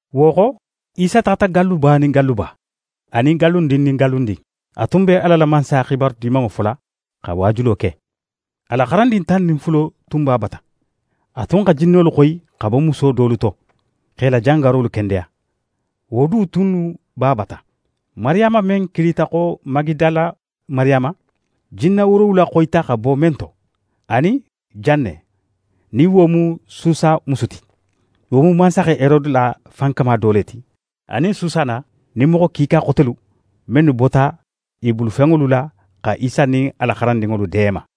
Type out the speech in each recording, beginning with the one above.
Wo xo, Isa taxata galluba nin galluba, anin gallundin nin gallundin, a tun be Ala la Mansaya xibaru Dimanŋo fola xa waajulo ke. A la xarandin tan nin fulo tun b'a bata. A tun xa jinnolu xoyi xa bo muso dolu to, x'e la jangarolu kendeya, wo du tunnu b'a bata: Mariyama men kilita xo Magidala Mariyama, jinna woorowula xoyita xa bo men to, anin Janne, nin wo mu Susa musu ti, wo mu mansaxe Herode la fankama do le ti, anin Susana nin moxo kiika xotelu mennu bota i bulufenŋolu la xa Isa nin a la xarandinŋolu deema.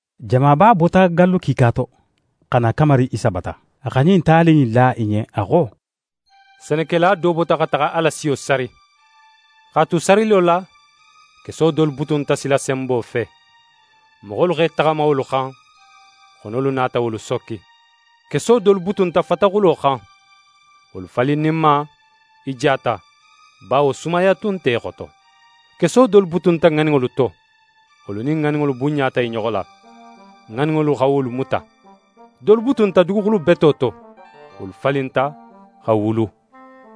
Jamaba bota gallu kiika to, xa na kamari Isa bata. A xa ɲin tali in la i ɲen, a xo: «Senekela do bota xa taxa a la siyo sari. X'a tu sarilo la, keso dolu butunta silasenbo fe: Moxolu x'e taxama wolu xan, xonolu nata wolu sokki. Keso dolu butunta fataxulo xan: Wolu falinninma, i jata, bawo sumaya tun nte i xoto. Keso dolu butunta ŋaninŋolu to: Wolu nin ŋaninŋolu bunɲata i ɲoxo la. Ŋaninŋolu xa wolu muta. Dolu butunta duguxulu beto to: Wolu falinta, xa wulu.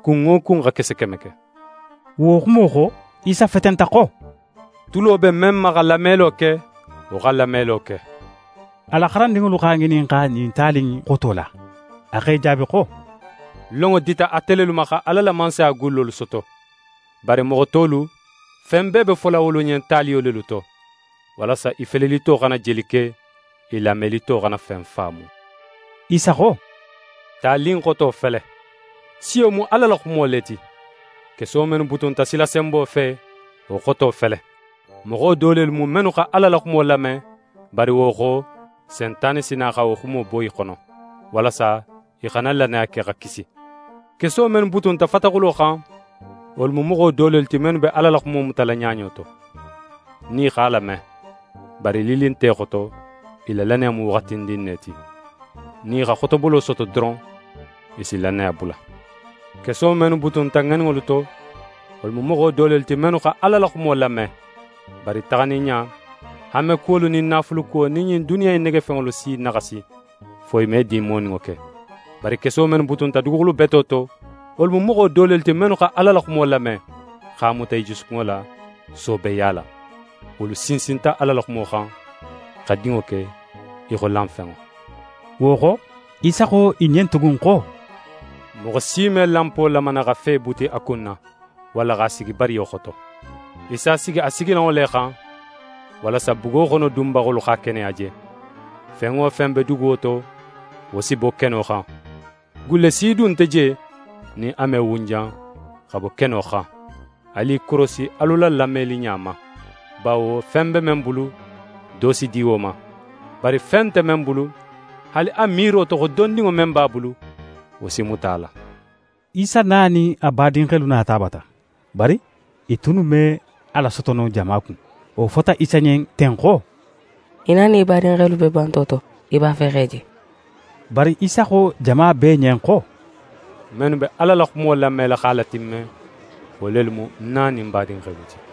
Kun wo kun xa kese keme ke.» Wo xumo xo, Isa fetenta xo: «Tulo be men ma xa lamelo ke, wo xa lamelo ke!» A la xarandinŋolu x'a ŋininxa ɲin tali in xoto la. A x'e jaabi xo: «Lonŋo dita ate lelu ma xa Ala la Mansaya gullolu soto. Bari moxo tolu, fen bee be fola wolu ɲen taliyo lelu to, walasa i felelito xana jeli ke, i lamelito xana fen faamu.» Isa xo: «Tali in xoto fele: Siyo mu Ala la xumo le ti. Keso mennu butunta silasenbo fe, wo xoto fele: Moxo do lelu mu, mennu xa Ala la xumo lame, bari wo xo, Sentane si na xa wo xumo bo i xono, walasa i xana lannaya ke, xa kisi. Keso mennu butunta fataxulo xan, wolu mu moxo do lelu ti, mennu be Ala la xumo mutala ɲaɲo to, nin i x'a lame. Bari lilli nte i xoto, i la lannaya mu waxatindin ne ti. Nin i xa xotobolo soto doron, i si lannaya bula. Keso mennu butunta ŋaninŋolu to, wolu mu moxo do lelu ti, mennu xa Ala la xumo lame. Bari taxanin ɲa, hanmekuwolu nin naafulukuwo nin ɲin duniya in negefenŋolu si i naxasi, fo i me din moninŋo ke. Bari keso mennu butunta duguxulu beto to, wolu mu moxo do lelu ti, mennu xa Ala la xumo lame, x'a muta i jusukunŋo la, soobeya la. Wolu sinsinta Ala la xumo xan, xa dinŋo ke í xo lanfenŋo.» Wo xo, Isa xo i ɲen tugun xo: «Moxo si me lanpo lamana xa fe buti a kun na, walla x'a sigi bariyo xoto. Í s'a sigi a sigilanŋo le xan, walasa bugo xono dunbaxolu x'a keneya je. Fen wo fen be duguwo to, wo si bo keno xan. Gulle si du nte je nin a me wunjan xa bo keno xan. Alu i korosi alu la lameliɲa ma! Bawo fen be men bulu, do si di wo ma; bari fen nte men bulu, haali a miiro to xo dondinŋo men b'a bulu, wo si muta a la.» Isa na nin a badinxelu nata a bata, bari i tunnu me a lasoto no jama kun. Wo fota Isa ɲen ten xo: «Í na nin í badinxelu be banto to, i b'a fe x'é je.» Bari Isa xo jama bee ɲen xo: «Mennu be Ala la xumo lamela x'a latimme, wo lelu mu ń na nin ń badinxelu ti.»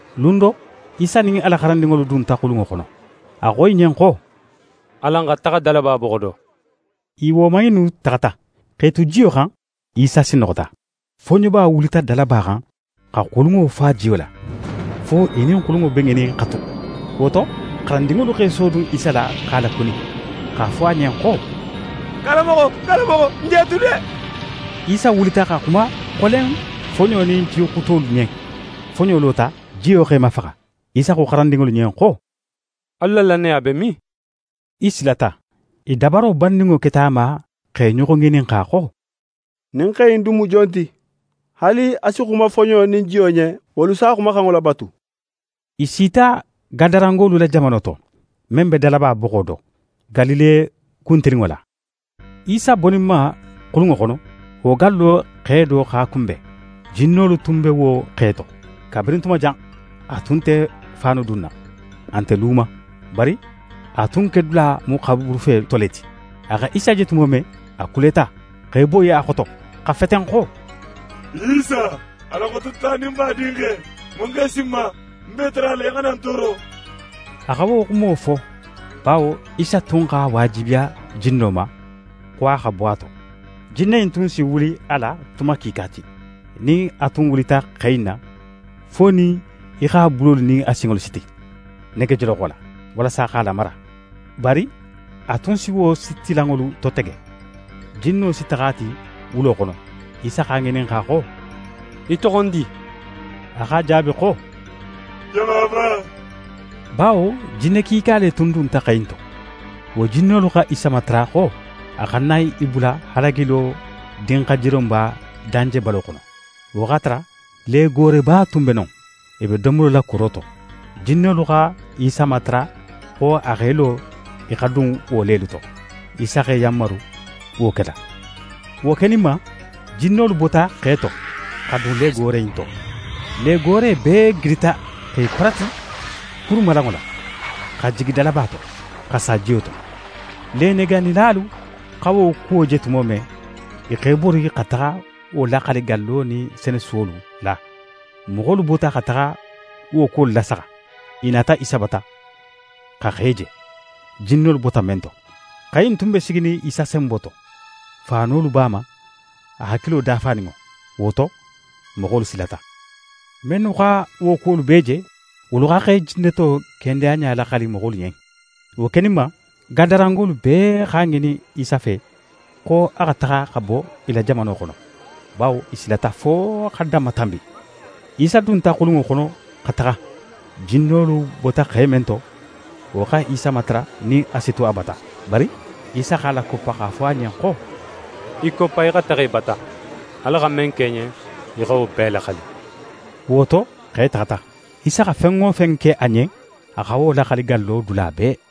Lun do, Isa nin a la xarandinŋolu dunta xulunŋo xono. A xo i ɲen xo: «Alan xa taxa dalaba boxo do.» I woman innu taxata. X'e tu jiyo xan, Isa sinnoxota. Foɲoba wulita dalaba xan, xa xulunŋo fa jiyo la, fo i nin xulunŋo be ŋinin xa tu. Wo to xarandinŋolu x'e sodun Isa la x'a lakuni, x'a fo a ɲen xo: «Karanmoxo, karanmoxo, n je tu de!» Isa wulita xa xuma xolen foɲo nin jixutolu ɲen. Foɲo lota, jiyo x'é mafaxa. Isa xo xarandinŋolu ɲen xo: «Alu la lannaya be min?» I silata. I dabaro banninŋo keta a ma x'e ɲoxo ŋininxa xo: «Ɲin xe in dun mu jon ti? Haali a si xuma foɲo nin jiyo ɲen, wolu s'a xumaxanŋo labatu.» I sita Gadarangolu la jamano to, men be dalaba boxo do, Galile kuntilinŋo la. Isa boninma xulunŋo xono, wo gallo xe do x'a kunben. Jinnolu tunnu be wo xe to. Kabirin tuma jan, a tun nte faanu dunna, a nte lu ma, bari a tun kedula mu xaburufe to le ti. A xa Isa je tumo men, a kuleta, x'é boyi a xoto, xa feten xo: «Isa, Ala Xototaninba Dinxe, mun x'é si ń ma? Ń b'é matarala í xana ń tooro.» A xa wo xumo fo, bawo Isa tun x'a waajibiya jinno ma xo a xa bo a to. Jinne in tun si wuli a la tuma kiika ti. Nin a tun wulita xe in na, fo nin í x'a bulolu nin a sinŋolu siti negejoloxo la, walasa x'a lamara. Bari a tun si wo sitilanŋolu totege, jinno si taxa a ti wulo xono. Isa x'a ŋininxa xo: «Í toxondi?» A x'a jaabi xo: «Jamaba.» Bawo jinne kiika le tun dunta xe in to. Wo jinnolu xa Isa matara xo a xana i bula halagilo dinxajironba danjebalo xono. Wo x'a tara legooreba tun be non, i be domolo la kuro to. Jinnolu xa Isa matara xo a x'é lo i xa dun wo lelu to. Isa x'e yanmaru wo kela. Wo keninma, jinnolu bota xe to xa dun legoore in to. Legoore bee gidita x'e parati kurumalanŋo la, xa jigi dalaba to, xa sa jiyo to. Lenegaanilalu xa wo kuwo je tumo men, i x'e bori xa taxa wo laxali gallo nin senesuwolu la. Moxolu bota xa taxa wo kuwolu lasaxa. I nata Isa bata, xa xe je, jinnolu bota men to. Xe in tun be siginin Isa senbo to, faanolu b'a ma, a hakilo dafaninŋo. Wo to, moxolu silata. Mennu xa wo kuwolu bee je, wolu xa xe jinneto kendeyaɲa laxali moxolu ɲen. Wo keninma, Gadarangolu bee x'a ŋinin Isa fe, xo a xa taxa xa bo i la jamano xono, bawo i silata fo xa danmatanbi. Isa dunta xulunŋo xono xa taxa. Jinnolu bota xe men to, wo xa Isa matara nin a si tu a bata. Bari Isa x'a lakoppa x'a fo a ɲen xo: «Í koppa, í xa taxa í bata. Ala xa men ke í ɲen, í xa wo bee laxali.» Wo to, xe taxata. Isa xa fen wo fen ke a ɲen, a xa wo laxali gallo dula bee.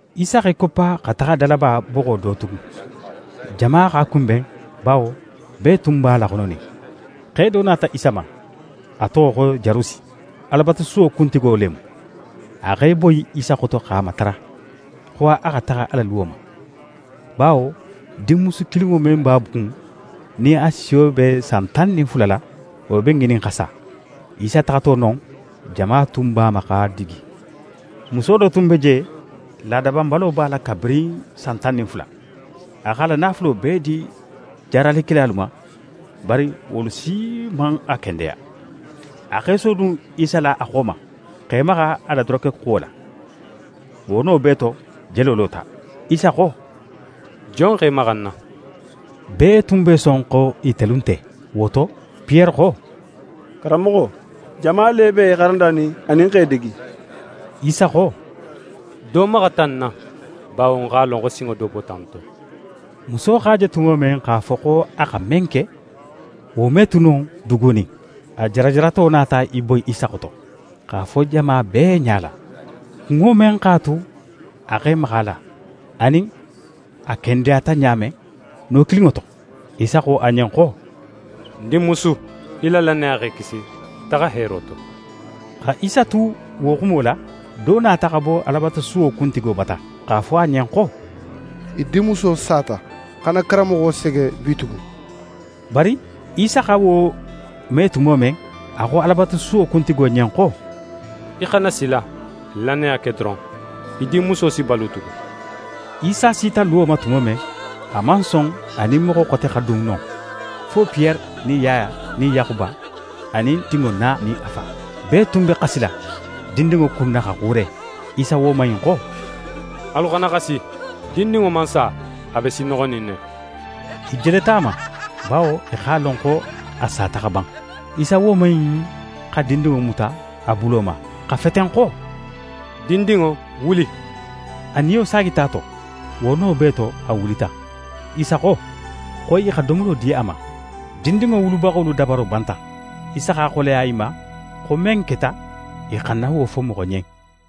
Isa x'é koppa xa taxa dalaba boxo do tugun. Jama x'a kunben, bawo bee tun b'a laxononin. Xe do nata Isa ma, a toxo xo Jarusi. Alabatusuwo kuntigo le mu. A x'é boyi Isa xoto x'a matara, xo a xa taxa a la luwo ma, bawo dinmusu kilinŋo men b'a kun, nin a siyo be san tan nin fula la, wo be ŋinin xa sa. Isa taxato non, jama tun b'a ma x'a digi. Muso do tun be je, laada banbalo b'a la kabirin san tan nin fula. A x'a la naafulo bee di jaaralikelalu ma, bari wolu si man a kendeya. A x'é sodun Isa la a xo ma, x'é maxa a la dorokexuwo la. Wo no bee to, jelo lota. Isa xo: «Jon x'é maxa ń na?» Bee tun b'e son xo itelu nte. Wo to, Piyere xo: «Karanmoxo, jama le b'é xarandanin, anin x'é digi.» Isa xo: «Do maxata ń na, bawo ń x'a lon xo sinŋo do bota ń to.» Muso x'a je tumo men x'a fo xo a xa men ke, wo me tu no dugunin, a jarajarato nata í boyi Isa xoto, x'a fo jama bee ɲala, kunŋo men x'a tu a x'é maxa a la, anin a kendeyata ɲa men, no kilinŋo to. Isa xo a ɲen xo: «Ń dinmusu, í la lannaya x'é kisi. Taxa heero to!» Xa Isa tu wo xumo la, do nata xa bo Alabatusuwo kuntigo bata, x'a fo wo ɲen xo: «Í dinmuso sata. Xana karanmoxo sege bitugun!» Bari Isa xa wo me tumo men, a xo Alabatusuwo kuntigo ɲen xo: «Í xana sila! Lannaya ke doron! Í dinmuso si balu tugun.» Isa sita luwo ma tumo men, a man son a nin moxo xote xa dun non, fo Piyere nin Yaya nin Yaxuba anin dinŋo na nin a fa. Bee tun be xasila dindinŋo kunna xa xuure. Isa woman in xo: «Alu xana xasi. Dindinŋo man sa. A be sinnoxonin ne.» I jeleta a ma, bawo i x'a lon xo a sata xa ban. Isa woman in xa dindinŋo muta a bulo ma, xa feten xo: «Dindinŋo, wuli!» A niyo saagita a to, wo no bee to, a wulita. Isa xo, xo i xa domolo di a ma. Dindinŋo wulubaxolu dabaro banta. Isa x'a xoleya i ma xo men keta, i xana wo fo moxo ɲen.